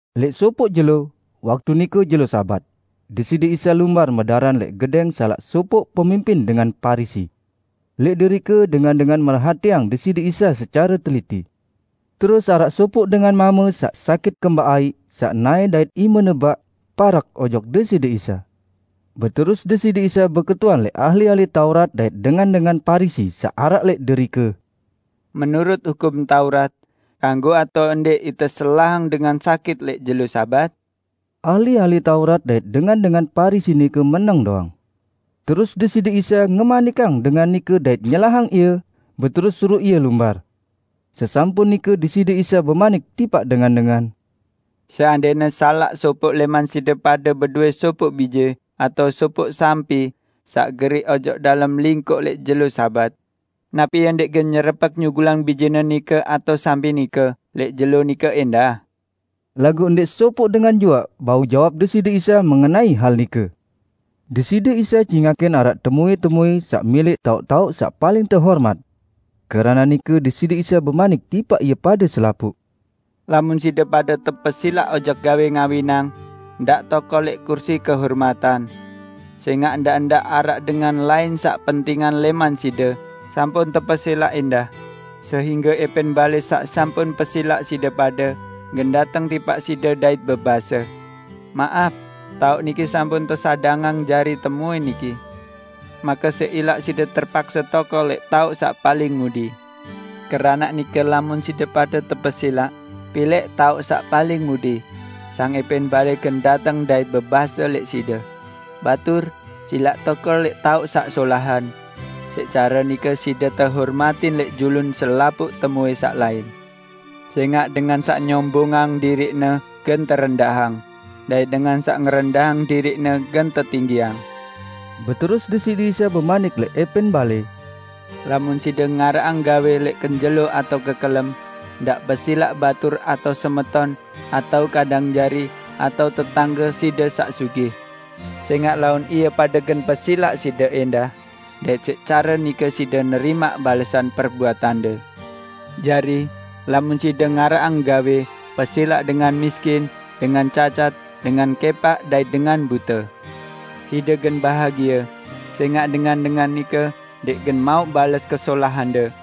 Lẽq sopoq jelo, waktu nike jelo Sabat, Deside Isa lumbar medaran lẽq gedẽng salaq sopoq pemimpin dengan Parisi. Lẽq derike dengan-dengan merhatiang Deside Isa secare teliti. Terus araq sopoq dengan mame saq sakit kembaq aiq saq naẽ dait imene baq parek ojok Deside Isa. Beterus Deside Isa beketuan lẽq ahli-ahli Taurat dait dengan-dengan Parisi saq araq lẽq derike, "Menurut Hukum Taurat, kanggo atao ndẽq ite selahang dengan sakit lẽq jelo Sabat?" Ahli-ahli Taurat dait dengan-dengan Parisi nike meneng doang. Terus Deside Isa ngemanikang dengan nike dait nyelahang ie, beterus suruq ie lumbar. Sesampun nike Deside Isa bemanik tipaq dengan-dengan, "Seandẽne salaq sopoq lẽman side pade bedowẽ sopoq bije atao sopoq sampi saq geriq ojok dalem lingkoq lẽq jelo Sabat, napi ie ndẽq gen nyerepek nyugulang bijene nike atao sampi nike lẽq jelo nike ẽndah?" Laguq ndẽq sopoq dengan juaq bau jawab Deside Isa mengenai hal nike. Deside Isa cingakin araq temuẽ-temuẽ saq milẽq taoq-taoq saq paling tehormat. Keranaq nike Deside Isa bemanik tipaq ie pade selapuq. "Lamun side pade tepesilaq ojok gawẽ ngawinang, ndaq tokol lẽq kursi kehormatan. Sẽngaq ndaq-ndaq araq dengan lain saq pentingan lẽman side sampun tepesilaq ẽndah, sehingge ẽpẽn balẽ saq sampun pesilaq side pade, gen dateng tipaq side dait bebase, 'Maap, taoq niki sampun tesadangang jari temuẽ niki.' Make siq ilaq side terpakse tokol lẽq taoq saq paling mudi. Keranaq nike lamun side pade tepesilaq, pilẽq taoq saq paling mudi, sang ẽpẽn balẽ gen dateng dait bebase lẽq side, 'Batur, silaq tokol lẽq taoq saq solahan.' Siq care nike side tehormatin lẽq julun selapuq temuẽ saq lain. Sẽngaq dengan saq nyombongang diriqne gen terendahang, dait dengan saq ngerendahang diriqne gen tetinggiang." Beterus Deside Isa bemanik lẽq ẽpẽn balẽ, "Lamun side ngaraqang gawẽ lẽq kenjelo atao kekelem, ndaq pesilaq batur atao semeton, atao kadang jari, atao tetangge side saq sugih. Sẽngaq laun ie pade gen pesilaq side ẽndah, dait siq care nike side nerimaq balesan perbuatande. Jari, lamun side ngaraqang gawẽ, pesilaq dengan miskin, dengan cacat, dengan kẽpaq dait dengan bute. Side gen bahagie, sẽngaq dengan-dengan nike ndẽq gen mauq bales kesolahande.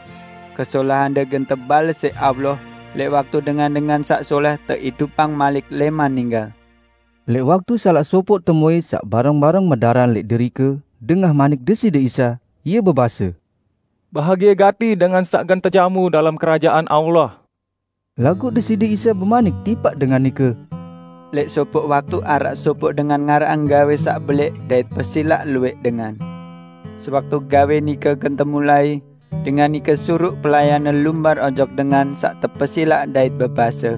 Kesolahande gen tebales siq Allah lẽq waktu dengan-dengan saq solẽh teidupang malik lẽman ninggal." Lẽq waktu salaq sopoq temuẽ saq bareng-bareng medaran lẽq derike dengah manik Deside Isa, ie bebase, "Bahagie gati dengan saq gen tejamu dalem Kerajaan Allah!" Laguq Deside Isa bemanik tipaq dengan nike, "Lẽq sopoq waktu araq sopoq dengan ngaraqang gawẽ saq belẽq dait pesilaq luwẽq dengan. Sewaktu gawẽ nike gen temulai, dengan nike suruq pelayanne lumbar ojok dengan saq tepesilaq dait bebase,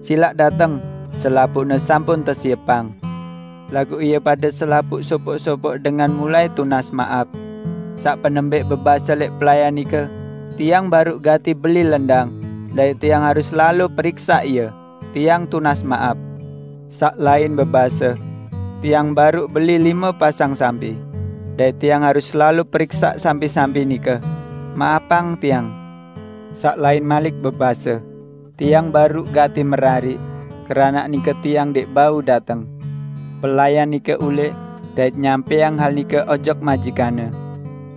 'Silaq dateng, selapuqne sampun tesiepang!' Laguq ie pade selapuq, sopoq-sopoq dengan mulai tunas maap. Saq penembẽq bebase lẽq pelayan nike, 'Tiang baruq gati beli lendang, dait tiang harus lalo periksaq ie. Tiang tunas maap.' Saq lain bebase, 'Tiang baruq beli lime pasang sampi, dait tiang harus lalo periksaq sampi-sampi nike. Maapang tiang.' Saq lain malik bebase, 'Tiang baruq gati merariq, keranaq nike tiang ndẽq bau dateng.' Pelayan nike ulẽq, dait nyampẽang hal nike ojok majikanne.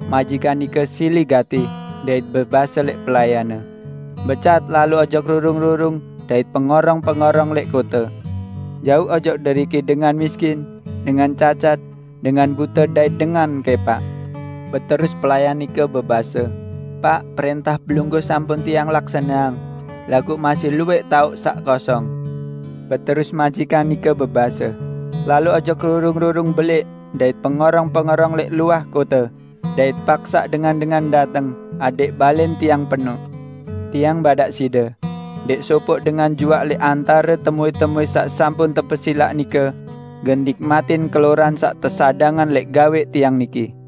Majikan nike sili gati, dait bebase lẽq pelayanne, 'Becat lalo ojok rurung-rurung dait pengorong-pengorong lẽq kote. Jauq ojok deriki dengan miskin, dengan cacat, dengan bute dait dengan kẽpaq.' Beterus pelayan nike bebase, 'Paq, prẽntah pelungguh sampun tiang laksaneang, laguq masih luwẽq taoq saq kosong.' Beterus majikan nike bebase, 'Lalo ojok rurung-rurung belẽq dait pengorong-pengorong lẽq luah kote, dait paksaq dengan-dengan dateng, adẽq balẽn tiang penoq. Tiang badaq side, ndẽq sopoq dengan juaq lẽq antare temuẽ-temuẽ saq sampun tepesilaq nike gen nikmatin keloran saq tesadangan lẽq gawe tiang niki!' "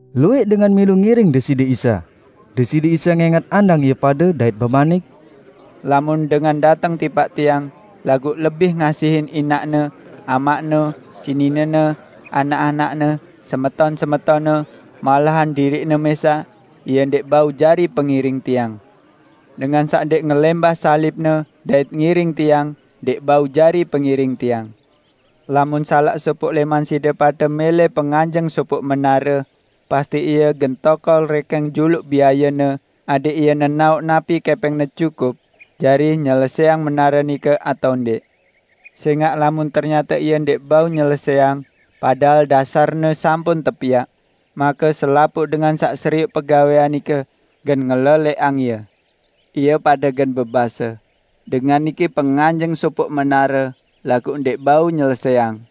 Luwẽq dengan milu ngiring Deside Isa. Deside Isa ngẽngat andang ie pade dait bemanik, "Lamun dengan dateng tipaq Tiang, laguq lebih ngasihin inaqne, amaqne, seninene, anak-anakne, semeton-semetonne, malahan diriqne mẽsaq, ie ndẽq bau jari pengiring Tiang. Dengan saq ndẽq ngelẽmbah salibne, dait ngiring Tiang, ndẽq bau jari pengiring Tiang. Lamun salq sopoq lẽman side pade mẽlẽ penganjeng sopoq menare, pasti ie gen tokol rẽkẽng juluq biayene adẽq ie nenaoq napi kẽpẽngne cukup jari nyelesẽang menare nike atao ndẽq. Sẽngaq lamun ternyate ie ndẽq bau nyelesẽang, padahal dasarne sampun tepiaq, make selapuq dengan saq serioq pegawẽan nike gen ngelelẽqang ie. Ie pade gen bebase, 'Dengan niki penganjeng sopoq menare, laguq ndẽq bau nyelesẽang!'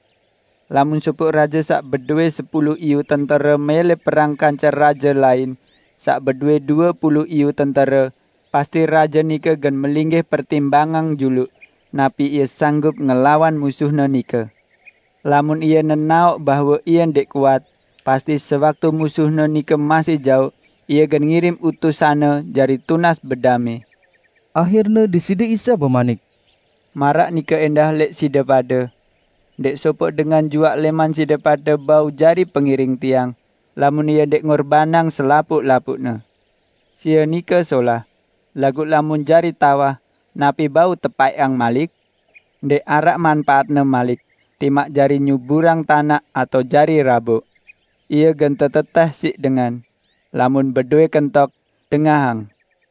Lamun sopoq raje saq bedowẽ sepulu iyu tentere mẽlẽ perang kance raje lain saq bedowẽ due pulu iyu tentere, pasti raje nike gen melinggih pertimbangang juluq napi ie sanggup ngelawan musuhne nike. Lamun ie nenaoq bahwe ie ndẽq kuat, pasti sewaktu musuhne nike masih jaoq, ie gen ngirim utusanne jari tunas bedamẽ." Ahirne Deside Isa bemanik, "Maraq nike ẽndah lẽq side pade. Ndẽq sopoq dengan juaq lẽman side pade bau jari pengiring Tiang, lamun ie ndẽq ngorbanang selapuq-lapuqne." "Sie nike solah, laguq lamun jari tawah, napi bau tepaẽqang malik? Ndẽq araq manpaatne malik, timaq jari nyuburang tanaq atao jari raboq. Ie gen tetetẽh siq dengan. Lamun bedowẽ kentok, dengahang!"